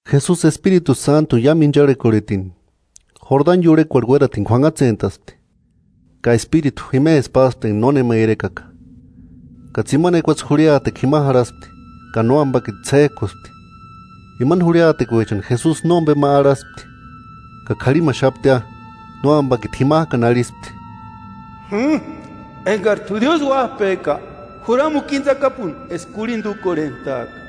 Jesusi Espiritu Sántuni iámu incharhekorhetini, Jordani iurhekuarhu uératini k'uanhatsentaspti. Ka Espiritu jimesï páspti enga nónema irekaka, ka tsimani ekuatse jurhiatekua jima jarhaspti, ka Nóambakiti ts'éjkuspti. Imani jurhiatekuechani Jesusi nómbema arhaspti, ka k'arhimaxaptia. Nóambakiti jimajkani arhispti: –Ekari sési jimbo Diósï Uájpeka, juramuku íni tsakapuni eska kurhinda úkorhentaaka.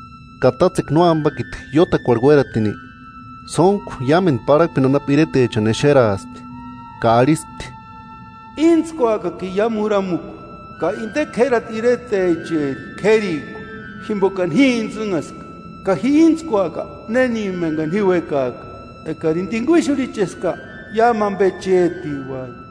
Ka tátsekua nóambakiti iótakuarhu uératini, sóntku iámendu parhakpeni anapu iretechani exeraaspti, ka arhispti: –Íntskuakakini iámu juramukua, ka inde k'érati iretecheri k'érikua. Jimbokani ji intsïnhaska, ka ji íntskuaka néni engani ji uékaaka. Ekarini tinguixurhicheska, iámu ambe chétiuati.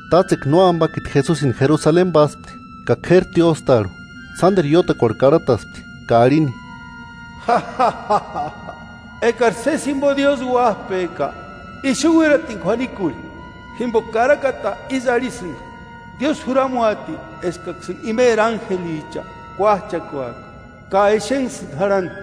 Tátsekua Nóambakiti Jesusini Jerusaleni páspti, ka k'éri tióstarhu, sánderu iótakuarhu karhataspti ka arhini: –Ekari sési jimbo Diósï Uájpeka, ixu uératini k'uanikurhi; jimboka karakata ísï arhisïnga: Diósï juramuati eskaksïni imeri ánjelicha kúajchakuaka ka exenksïni jarhani.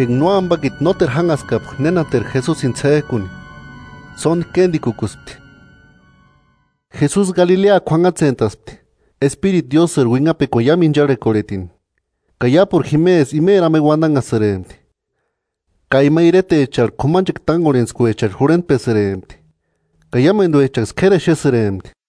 Enga Nóambakiti nóteru jánhaskapka nénateru Jesusini ts'éjkuni, sóndi kéndikukuspti. Jesusi Galilea k'uanhatsentaspti, Espiritu Diósïri uinhapekuani iámu incharhekorhetini, ka iápuru jimesï imeri ambe uandanhasïrempti. Ka ima iretecharhu k'umanchekua tángorhentskuecharhu jurhentpesïrempti, ka iámenduechaksï k'éri exesïrempti.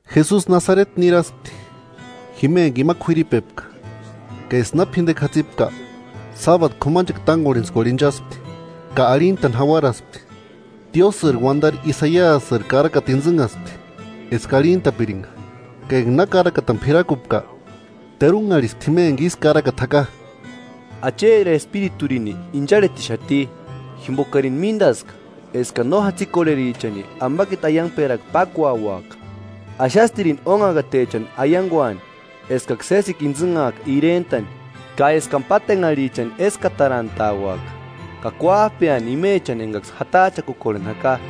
Jesusi Nasareti niraspti, jima enga ima k'uiripepka. Ka eska na p'indekua jatsipka, sábadu k'umanchekua tángorhentskuarhu inchaspti, ka arhintani jauaraspti. Diósïri uandari Isaiasiri karakata intsïnhaspti eska arhintapiringa. Ka enga na karakatani p'irakupka, terunharhispti jima enga ísï karakata jaka: “Acheri Espiriturini incharhetixati, jimbokarini míndaska eskani no jatsikorherichani ambakiti aiangperakua pákuauaka; axastirini ónhakatechani aianguani eskaksï sésikua intsïnhaaka irentani, ka eskani pátenharhichani éskatarantauaka; ka kuájpeani imechani engaksï jatajchakukorheni jaka;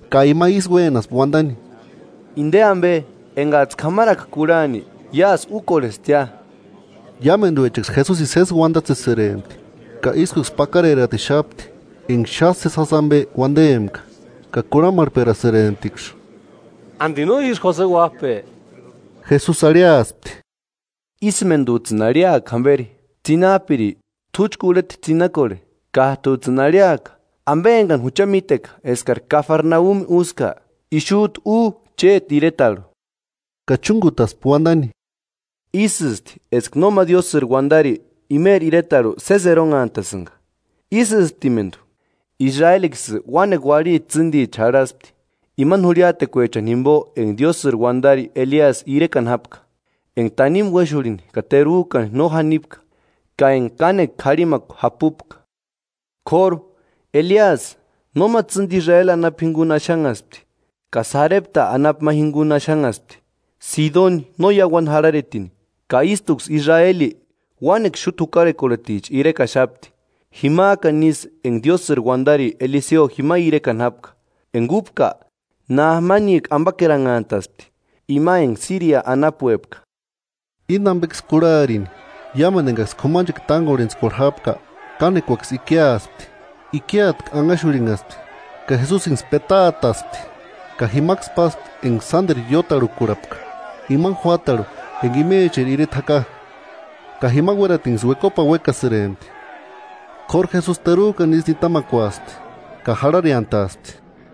Ka ima ísï uénaspti uandani: –Inde ambe, engajtsï k'amaraka kurhani iásï úkorhestia. Iámenduechaksï Jesusini sési uandatsesïrempti ka ískuksï pakareratixapti enga xáni sési jásï ambe uandempka. Ka kurhamarhperasïremptiksï: –¿Andi no ísï Jose uájpe? Jesusi arhiaspti: –Ísïmendujtsïni arhiakia jamberi: “Tsinajpiri, t'úchu urheta tsinakorhe.” Kájtujtsïni arhiaka: “Ambe engani jucha míteka eskari Kafarnaumi úska, ixujtu u chéti iretarhu.” Ka chúngutaspti uandani: –Ísïsti eska nóma Diósïri uandari imeri iretarhu sési eronhantasïnga. Ísïsptimendu, Israeliksï uánekua uarhiti tsîndicha jarhaspti, imani jurhiatekuechani jimbo enga Diósïri uandari Eliasï irekani jápka, enga tanimu uéxurhini ka terujkani no janipka ka enga kánekua k'arhimakua japupka. K'óru, Eliasï nóma tsîndi Israeli anapu jinguni axanhaspti, ka Sarepta anapu ma jinguni axanhaspti, Sidoni no iauani jarharetini. Ka ístuksï Israeli uánekua xúta jukarhekorhericha irekaxapti, jimajkani isï enga Diósïri uandari Eliseo jima irekani jápka, enga úpka, Naamanijku ambakeranhastaspti, ima enga Síria anapuepka. Íni ambeksï kurharini, iámendu engaksï k'umanchekua tángorhentskuarhu jápka kánekuaksï ikiaspti. Ikiatku anhaxurhinhaspti ka Jesusinksï petaataspti, ka jimaksï páspti enga sánderu iótarhukurhapka, imani juátarhu enga imecheri ireta jaka, ka jima uératinksï uekopani uéksïrempti. K'óru Jesusi terujkani ísï nitamakuaspti ka jarhareantaaspti.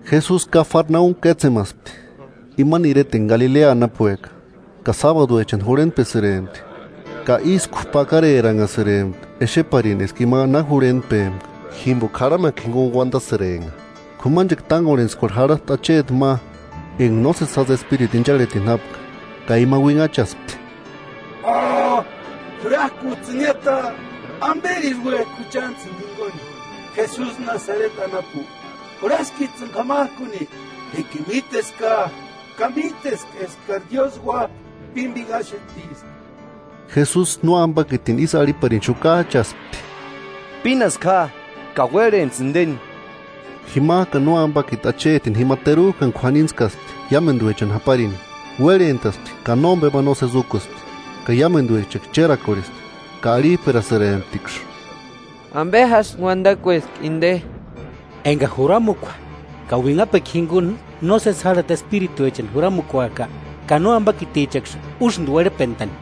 Jesusi Kafarnaumi kétsemaspti, imani ireta enga Galilea anapueka, ka sábaduechani jurhentpesïrempti. Ka ísku pakareranhasïrempti exeparini eska ima na jurhentpempka, jimboka jarhamekua jinguni uandasïrempka. K'umanchekua tángorhentskuarhu jarhaspti acheti ma enga nósesijasï espiritu incharhetini jápka, ka ima uinhachaspti: 34–¡Jurajkujtsïniata! ¿Amberi uéksïni juchantsïni jinguni, Jesusi Nasareti anapu? ¿Jurhaskijtsïni k'amajkuni? Jíkini míteska, ka míteska eskari Diósï Uájpa pímbinhaxetiska. Jesusi nóambakitini ísï arhiparini xukajchaspti: ¡Pínasku ja ka uérhentsï indeni! Jimajkani nóambakiti achetini jima terujkani k'uanintskaspti iámenduechani japarini, uérhentaspti ka nómbema nósesi úkuspti. Ka iámenduechaksï chérakorhespti, ka arhijperasïremptiksï: –¿Ambe jásï uandakueski inde? Enga juramukua ka uinhapekua jinguni nósesi járhati espirituechani juramukuajka, ¡Ka nóambakitichaksï úsïndi uérhpentani!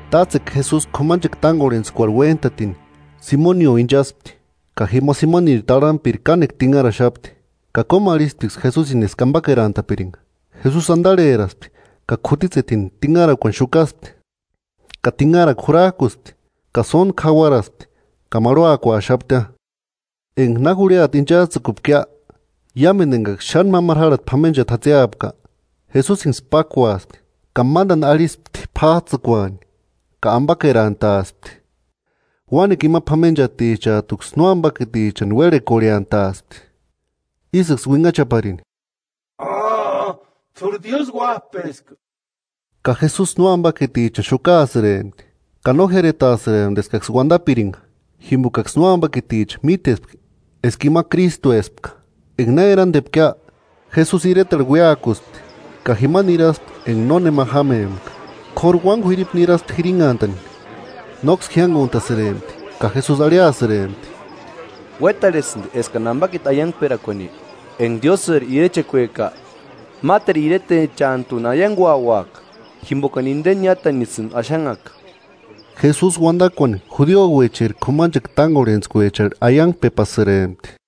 Tátsekua Jesusi k'umanchekua tángorhentskuarhu uéntatini Simonio inchaspti. Ka jima Simoniri tarhampiri kánekua tinharaxapti, ka kómarhisptiksï Jesusini eska ambakerantapiringa. Jesusi andarheraspti ka k'utitsetini tinharakuani xukaspti, ka tinharakua jurajkuspti. Ka sóntku jauaraspti, ka marhuakuaxaptia. Enga na jurhiata ínchajtsïkupkia, iámendu engaksï xáni mámaru járhati p'amenchati jatsiapka, Jesusinksï pákuaspti; ka mándani arhispti p'ájtsïkuani, ka ambakerantaaspti. Uánekua ima p'amenchatichajtuksï nóambakitichani uérhekorhentaspti, ísïksï uinhachaparini: –¡T'úri Diósï uájpeska! Ka Jesusi nóambakitichani xukaasïrempti, ka no jiáretaasïrempti eskaksï uandapiringa, jimbokaksï nóambakiticha mítespka eska ima Krístuespka. Enga na erandepkia, Jesusi iretarhu uéakuspti, ka jima niraspti enga nónema jámempka. K'óru uáni k'uiripu niraspti jirinhantani. Nóksï jiánguntasïrempti, ka Jesusi arhiasïrempti: –Uétarhesïndi eskani ambakiti aiangperakuani; enga Diósïri irechekueka máteru iretechantuni aianguauaka, jimbokani indeni niátanisïni axanhaka. Jesusi uandakuani judiouecheri k'umanchekua tángorhentskuecharhu aiangpepasïrempti.